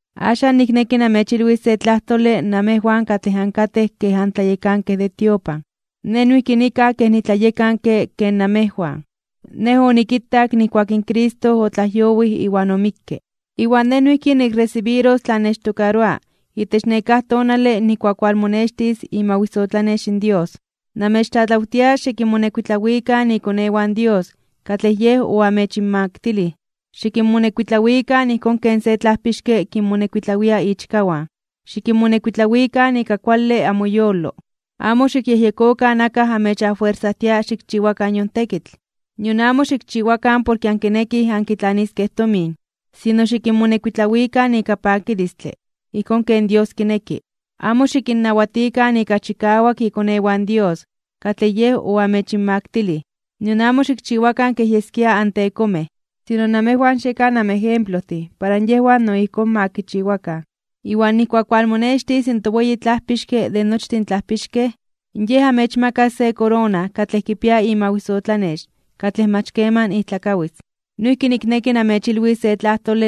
Axan nikneki namechilwis se tlajtole namejwan katlej ankatej kej antlayekankej de tiopan. Nej noijki nikaj kej nitlayekanke ken namejwan. Nej onikitak nijkuak in Cristo otlajyowij iwan omikke. Iwan nej noijki nikresibiros tlan nechtokaroa itech nekáj tonale nijkuak walmonextis imawisotlanex in Dios. Namechtlatlawtia xikinmonekuitlawikan ikonewan Dios katlej Yej oamechinmaktilij, xikinmonekuitlawikan ijkón ken se tlajpixke kinmonekuitlawia ichkawan. Xikinmonekuitlawikan ika kuale amoyolo. Amo xikyejyekokan akaj amechafuersajtia xikchiwakan yon tekitl, nion amo xikchiwakan porke ankinekij ankitlaniskej tomin. Sino xikinmonekuitlawikan ika pakilistle, ijkón ken Dios kineki. Amo xikinnawatikan ika chikawak ikonewan Dios katlej Yej oamechinmaktilij, nion amo xikchiwakan kej yeskia antekomej. Sino namejwan xiekan amejemplojtin para yejwan no ijkón ma kichiwakan. Iwan nijkuak walmonextis in toweyi Tlajpixke de nochtin tlajpixkej, Yej amechmakas se korona katlej kipia imawisotlanex katlej mach keman ijtlakawis. Noijki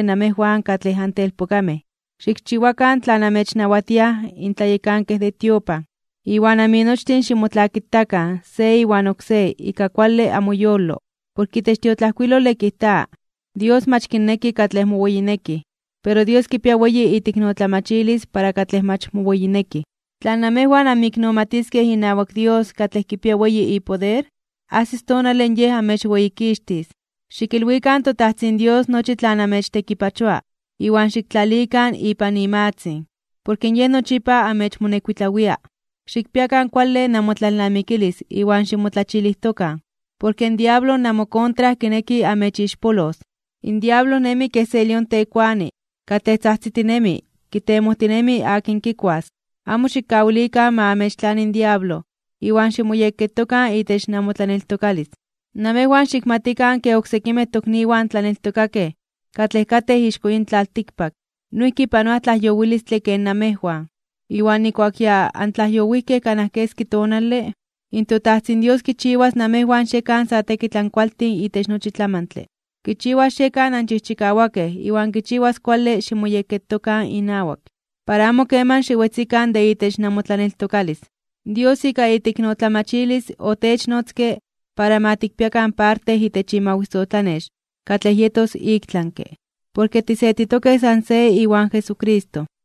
namejwan katlej antelpokamej, nikneki xikchiwakan tlan amechnawatiaj in tlayekankej de tiopan. Iwan aminochtin ximotlakitakan se iwan oksé ika kuale amoyolo, porke itech tiotlajkuilole kijta: Dios mach kinneki katlej moweyinekij, pero Dios kipia weyi iteiknotlamachilis para katlej mach moweyinekij. Tla namejwan anmoiknomatiskej inawak Dios katlej kipia weyi ipoder, ajsis tonale Yej amechweyikixtis. Xikilwikan toTajtzin Dios nochi tlan amechtekipachoa iwan xiktlalikan ipan imatzin, porke Yej nochipa amechmonekuitlawia. Xikpiakan kuale namotlalnamikilis iwan ximotlachilijtokan, porke in diablo namokontra kineki amechixpolos. In diablo nemi kej se lión tekuani katlej tzajtzitinemi kitemojtinemi akin kikuas. Amo xikkawilikan ma amechtlani in diablo iwan ximoyekketokan itech namotlaneltokalis. Namejwan xikmatikan ke oksekimej tokniwan tlaneltokakej katlej katej ixko yin tlaltikpak noijki panoaj tlajyowilistle ken namejwan. Iwan nijkuak ya antlajyowijkej kanaj keski tonale, in toTajtzin Dios kichiwas namejwan xiekan sa tekitl ankualtin itech nochi tlamantle. Kichiwas xiekan anchijchikawakej iwan kichiwas kuale ximoyekketokan inawak, para amo keman xiwetzikan de itech namotlaneltokalis. Dios ika iteiknotlamachilis otechnotzke para ma tikpiakan parte itech imawisotlanex katlej yetos iktlanke (ik tlami), porke tisetitokej san se iwan Jesucristo.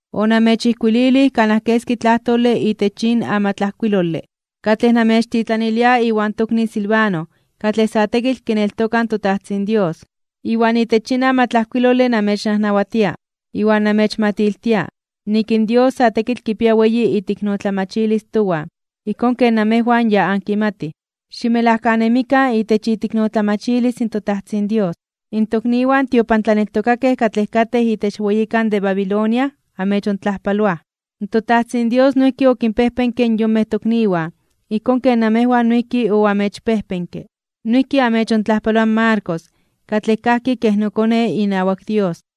Onamechijkuilij kanaj keski tlajtlole itech yin amatlajkuilole, katlej namechtitlanilia iwan tokni Silvano katlej sa tekitl kineltoka in toTajtzin Dios. Iwan itech yin amatlajkuilole namechnajnawatia iwan namechmatiltia nik in Dios sa tekitl kipia weyi iteiknotlamachilis towan ijkón ken namejwan ya ankimatij. Ximelajkanemikan itech iteiknotlamachilis in toTajtzin Dios. In tokniwan tiopantlaneltokakej katlej katej itech weyikan de Babilonia amechontlajpaloaj. ToTajtzin Dios noijki okinpejpenke in yonmej tokniwan ijkón ken namejwan noijki oamechpejpenke. Noijki amechontlajpaloa in Marcos katlej kajki kej nokone inawak Dios.